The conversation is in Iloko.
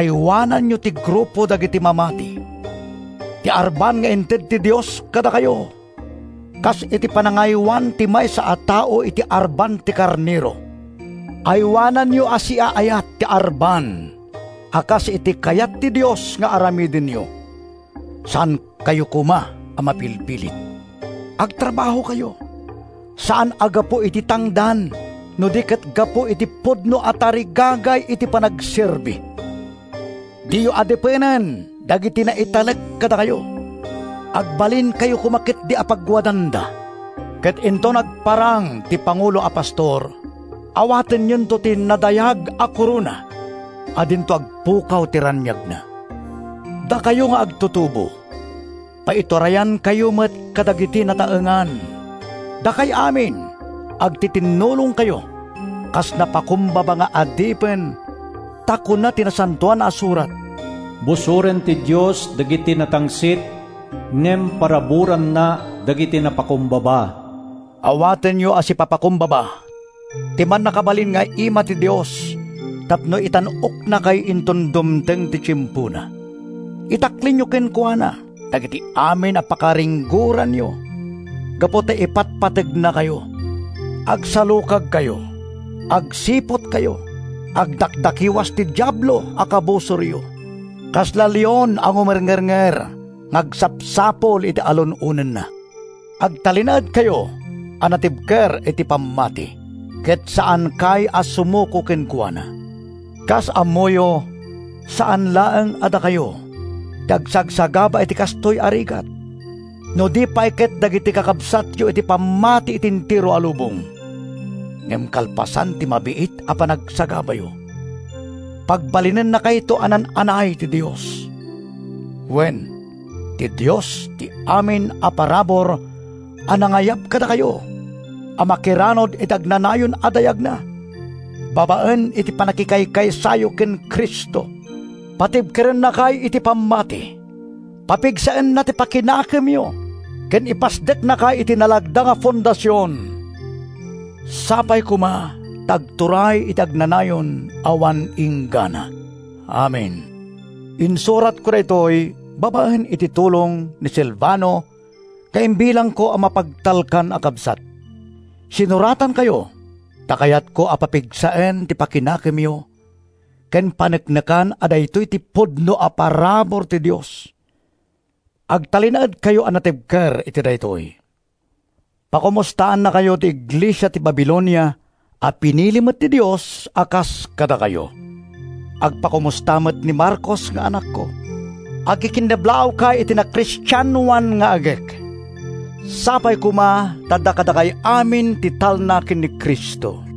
aywananyo ti grupo dagiti mamati, ti arban nga inted ti Dios kadakayo, kas iti panangaywan ti maysa a tao iti arban ti karnero. Aywananyo a siaayat ti arban a kas iti kayat ti Dios nga aramidenyo. Saankayo koma a mapilpilit. Agtrabahokayo, saan a gapu iti tangdan, no di ket gapu iti pudno a tarigagay iti panagserbi. Diyo adipenen dagiti naitalek kadakayo. Agbalinkayo koma ketdi a pagwadanda. Ket inton agparang ti Pangulo a Pastor, awatenyonto ti nadayag a korona a dinto agpukaw ti raniagna. Dakayo nga agtutubo, paiturayankayo met kadagiti nataengan. Dakay amin, agtitinnulongkayo kas napakumbaba nga adipen, ta kuna ti Nasantoan a Surat, “Busoren ti Dios dagiti natangsit, ngem paraburanna dagiti napakumbaba.” Awatenyo a sipapakumbaba ti mannakabalin nga ima ti Dios tapno itan-oknakay inton dumteng ti tiempona. Itaklinyo kenkuana dagiti amin a pakaringgoranyo gapu ta ipatpategnakayo. Agsalukagkayo. Agsiputkayo. Agdakdakiwas ti Diablo a kabusoryo—kasla leon a ngumerngernger nga agsapsapul iti alun-onenna. Agtalinaedkayo a natibker iti pammati ket saankay a sumuko kenkuana. Kas ammoyo, saan laeng a dakayo ti agsagsagaba iti kastoy a rigat no di pay ket dagiti kakabsatyo iti pammati iti entero a lubong. Ngem kalpasan ti mabiit a panagsagabayo, pagbalinennakayto a naan-anay ti Dios. Wen, ti Dios ti amin a parabur a nangayab kadakayo a makiranud iti agnanayon a dayagna babaen iti pannakikaysayo ken Cristo. Patibkerennakay iti pammati, papigsaenna ti pakinakemyo ken ipasdeknakay iti nalagda a fondasion. Sapay koma ta agturay iti agnanayon awan inggana! Amen. Insuratko daytoy babaen iti tulong ni Silvano nga imbilangko a mapagtalkan a kabsat. Sinuratankayo ta kayatko a papigsaen ti pakinakemyo ken paneknekan a daytoy ti pudno a parabur ti Dios. Agtalinaedkayo a natibker iti daytoy. Pakomustaannakayo ti iglesia iti Babilonia a pinili met ti Dios a kas kadakayo. Agpakomusta met ni Marcos nga anakko. Agkikinnablaawkay iti nakristianoan nga agek. Sapay koma ta adda kadakay amin ti talna ken ni Cristo.